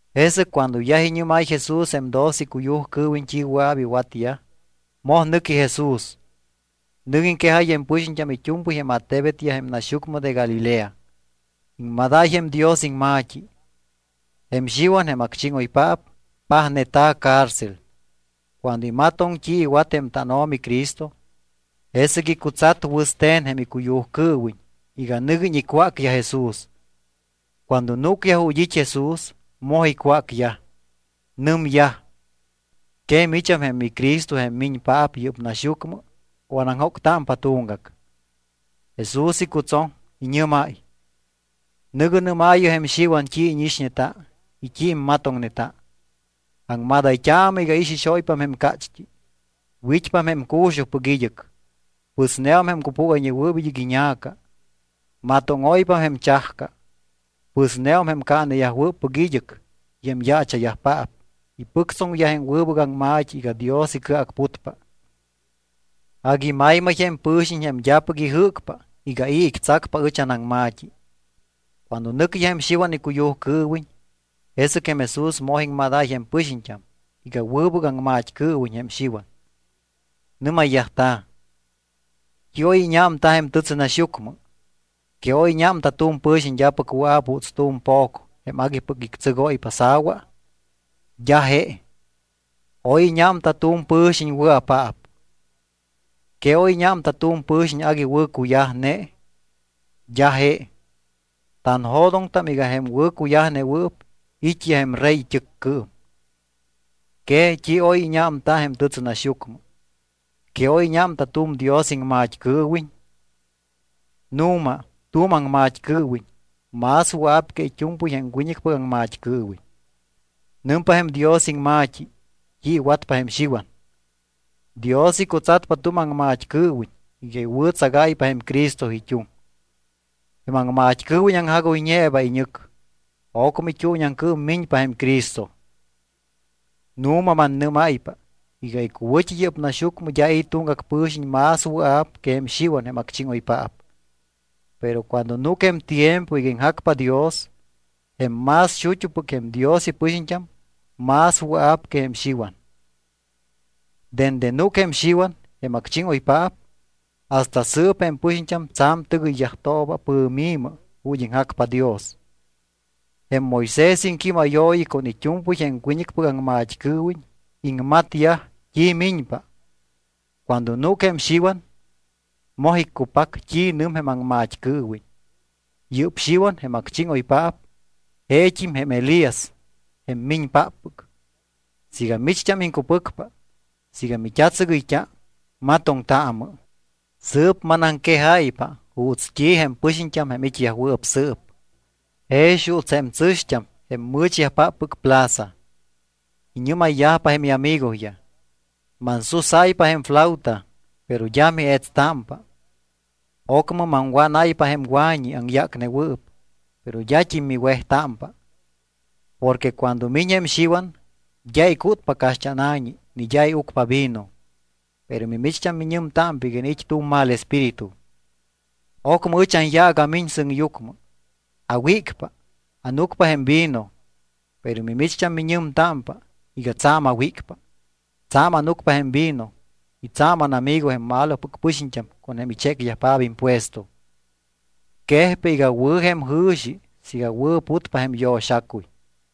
Jesɨc cuando yaj iñɨ́máy Jesús jém doce icuyujcɨɨwiñ t́i wɨa̱p iwatyaj, moj nɨqui Jesús. Nɨc iŋquejáy jém pɨxiñt́am it́u̱mpɨy jém attebetyaj jém naxyucmɨ de Galilea. Iŋmadáy jém Dios iŋma̱t́i. Jém Xiwan jém acchíŋoypaap pajneta̱ cárcel. Cuando imatoŋ t́i iwat jém tánO̱mi Cristo, jesɨc icutsat wɨste̱n jém icuyujcɨɨwiñ iga nɨguiñ icwácyaj Jesús. Cuando núcyaj ju̱t́ it́ Jesús, moj icwácyaj. Nɨmyaj: —¿Que micham jém miCristo jém miñpaap yɨ́p naxyucmɨ o anaŋjóctámpa tuŋgac? Jesús icutsoŋ. Iñɨ́máy: —Nɨ̱gɨ nɨ́maayɨ jém Xiwan t́i íñixñeta y t́i immatoŋneta. Aŋmadayt́aamɨ iga ixixóypam jém cácht́i, wit́pam jém cu̱xujpɨc id́ɨc, pɨsneum jém cupúgayñewɨɨp id́ɨc iña̱ca, matóŋóypam jém chajca, pɨsneum jém caaneyajwɨɨp id́ɨc y jém yaacha̱yajpaap ipɨctsoŋyaj jém wɨbɨc aŋma̱t́i iga Dios icɨacputpa. Agui maymay jém pɨ̱xiñ jém d́apɨc ijɨ́cpa iga i̱ ictsacpa ɨch anaŋma̱t́i. Cuando nɨcyaj jém Xiwan icuyujcɨɨwiñ, jesɨc jém Jesús moj iŋmadáy jém pɨxiñt́am iga wɨbɨc aŋmat́cɨɨwiñ jém Xiwan. Nɨ́mayyajta̱: —¿T́i oy íñámta jém tɨtsɨnaxyucmɨ? ¿Que oy íñámta tu̱m pɨ̱xiñ d́apɨc wɨa̱p juuts tu̱m po̱c jém aguipɨc ictsɨgóypa sa̱wa? D́a je. Oy íñámta tu̱m pɨ̱xiñ wɨa̱paap. ¿Que oy íñámta tu̱m pɨ̱xiñ agui wɨ̱cuyajne? D́a je. Tanjo̱doŋtam iga jém wɨ̱cuyajnewɨɨp it́yaj jém rey it́ɨccɨɨm. ¿Que t́i oy íñámta jém tɨtsɨnaxyucmɨ? ¿Que oy íñámta tu̱m Dios iŋmat́cɨɨwiñ? Nu̱ma tu̱m aŋmat́cɨɨwiñ más wɨa̱p que it́u̱mpɨy jém wiñɨcpɨc aŋmat́cɨɨwiñ. Nɨmpa jém Dios iŋma̱t́i t́i iwatpa jém Xiwan: Dios icutsatpa tu̱m aŋmat́cɨɨwiñ iga iwɨ̱tsagáypa jém Cristo it́uŋ. Jém aŋmat́cɨɨwiñ aŋjagoyñeeba iñɨc. Ocmɨ it́uuñiaŋcɨɨm miñpa jém Cristo. Nu̱ma mannɨ́máypa iga icuwɨ̱t́i yɨ́p naxyucmɨ d́a i̱ tuŋgac pɨ̱xiñ más wɨa̱p que jém Xiwan jém acchíŋoypaap. Pero cuando núc jém tiempo iga iŋjacpa Dios, jém más xut́upɨc jém Dios ipɨxiñt́am más wɨa̱p que jém Xiwan. ’Dende núc jém Xiwan, jém acchíŋoypaap, hasta sɨɨp jém pɨxiñt́am tsa̱m tɨgɨyyajtooba pɨ̱mi̱mɨ ju̱t́ iŋjacpa Dios. Jém Moisés iŋquímayooyi con it́u̱mpɨy jém wiñɨcpɨc aŋmat́cɨɨwiñ iŋmatyaj t́i miñpa. Cuando núc jém Xiwan, moj iccupac t́i nɨm jém aŋmat́cɨɨwiñ. Yɨ́p Xiwan, jém acchíŋoypaap, jeet́im jém Elías jém miñpáppɨc; siiga micht́am iŋcupɨcpa. Siiga mit́atsɨgɨyt́a, matoŋtaamɨ. ’Sɨɨp manaŋquejáypa juuts t́i jém pɨxiñt́am jém it́yajwɨɨp sɨɨp. Jex juuts jém tsɨ̱xt́am jém mɨ̱chyajpáppɨc plaza. Iñɨ́mayyajpa jém iamigoyaj: “Mansusáypa jém flauta, pero d́a mietstámpa. Ocmɨ maŋwánáypa jém wa̱ñi aŋyácnewɨɨp, pero d́at́im miwejtámpa.” Porque cuando miñ jém Xiwan, d́a icútpa caxt́ána̱ñi ni d́a iucpa vino, pero mimicht́am miñɨmtámpa iga iniit́ tu̱m mal espíritu. Ocmɨ ɨch anyaac amiñ sɨŋyucmɨ. Awícpa, ánucpa jém vino, pero mimicht́am miñɨmtámpa iga tsa̱m awícpa, tsa̱m ánucpa jém vino y tsa̱m ánamigo jém malopɨc pɨxiñt́am con jém ichécyajpaap impuesto. Quejpa iga wɨ̱ jém jɨ̱xi siiga wɨ̱putpa jém yo̱xacuy.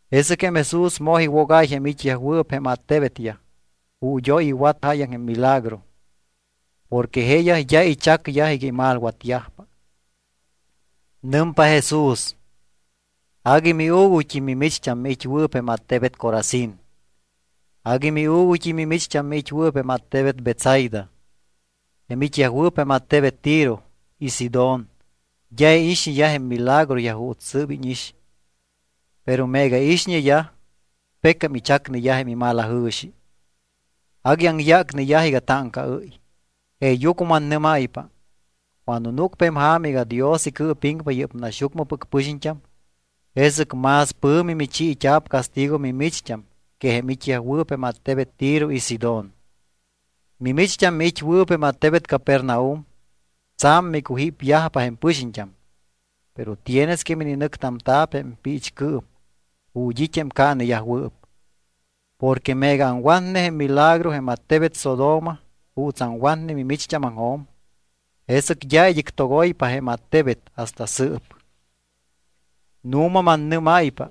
Jesɨc jém Jesús moj iwogáy jém it́yajwɨɨp jém attebetyaj ju̱t́ oy iwat jáyaŋ jém milagro porque jeeyaj d́a ichacyaj iga imalwatyajpa. Nɨmpa Jesús: —¡Agui miuuguyt́im mimicht́am miit́wɨɨp jém attebet Corazín! Agui miuuguyt́im mimicht́am miit́wɨɨp jém attebet Betsaida. Jém it́yajwɨɨp jém attebet Tiro y Sidón d́a iixñeyaj jém milagroyaj juuts sɨɨp íñix. Pero meega iixñeyaj, pecam ichacneyaj jém imalajɨ̱xi, agui aŋyácneyaj iga táŋcaɨ́y. Jeeyucmɨ mannɨ́máypa, cuando núcpa jém ja̱ma iga Dios icɨɨpiŋpa yɨ́p naxyucmɨpɨc pɨxiñt́am, jesɨc más pɨ̱mi michiit́a̱p castigo mimicht́am que jém it́yajwɨɨp jém attebet Tiro y Sidón. Mimicht́am miit́wɨɨp jém attebet Capernaum tsa̱m micujípyajpa jém pɨxiñt́am, pero tienes que mininɨctamta̱p jém piichcɨɨm ju̱t́ it́ jém caaneyajwɨɨp. Porque meega aŋwatne jém milagro jém attebet Sodoma juuts aŋwatne mimicht́ámaŋjo̱m, jesɨc d́a id́ɨc togoypa jém attebet hasta sɨɨp. Nu̱ma mannɨ́máypa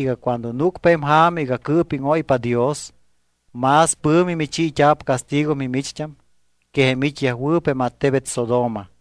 iga cuando núcpa jém ja̱ma iga cɨɨpíŋóypa Dios, más pɨ̱mi michiit́a̱p castigo mimicht́am que jém it́yajwɨɨp jém attebet Sodoma.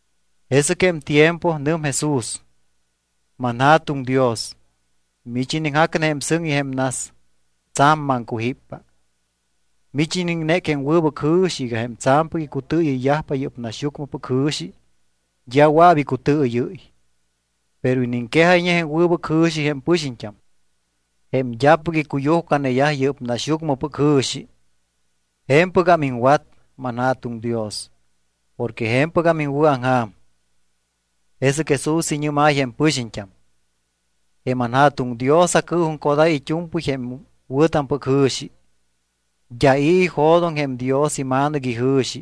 Jesɨc jém tiempo nɨm Jesús: —ManJa̱tuŋ Dios, mich iniŋjacne jém sɨŋ y jém nas, tsa̱m maŋcujíppa. Mich iniŋnéc jém wɨbɨc jɨ̱xi iga jém tsa̱mpɨc icutɨɨyɨyyajpa yɨ́p naxyucmɨpɨc jɨ̱xi d́a wɨa̱p icutɨɨyɨ́y. Pero iniŋquejayñe jém wɨbɨc jɨ̱xi jém pɨxiñt́am jém d́apɨc icuyujcaneyaj yɨ́p naxyucmɨpɨc jɨ̱xi. Je̱mpɨgam iŋwat, manJa̱tuŋ Dios, porque je̱mpɨgam iŋwɨ̱aŋja̱m. Jesɨc Jesús iñɨ́máy jém pɨxiñt́am: —Jém anJa̱tuŋ Dios acɨɨjuŋcodáy it́u̱mpɨy jém wɨ̱tampɨc jɨ̱xi. D́a i̱ ijo̱doŋ jém Dios iMa̱nɨc ijɨ̱xi,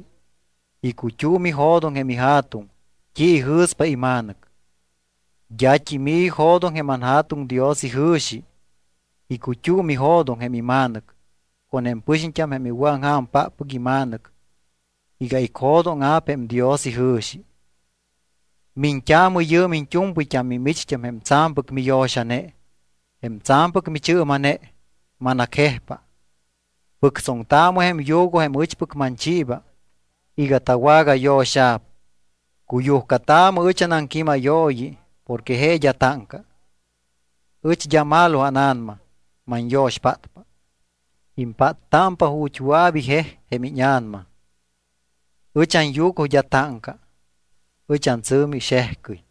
icut́um ijo̱doŋ jém iJa̱tuŋ t́i ijɨ̱spa iMa̱nɨc. D́at́im i̱ ijo̱doŋ jém anJa̱tuŋ Dios ijɨ̱xi, icut́um ijo̱doŋ jém iMa̱nɨc con jém pɨxiñt́am jém iwɨ̱aŋja̱mpáppɨc iMa̱nɨc iga icjo̱dóŋa̱p jém Dios ijɨ̱xi. Miñt́aamɨ yɨɨm iñt́u̱mpɨyt́am mimicht́am jém tsa̱mpɨc miyo̱xane, jém tsa̱mpɨc michɨɨma̱ne, manacjejpa. Pɨctsoŋtaamɨ jém yugo jém ɨchpɨc manchiiba iga tawagayo̱xa̱p. Cuyujcataamɨ ɨch anaŋquímayooyi porque je d́a táŋca. Ɨch d́a malo ána̱nama. Manyo̱xpátpa. Impáttámpa ju̱t́ wɨa̱p ijej jém íña̱nama. Ɨch anyugo d́a táŋca. Ɨch antsɨ̱mi xejcɨy.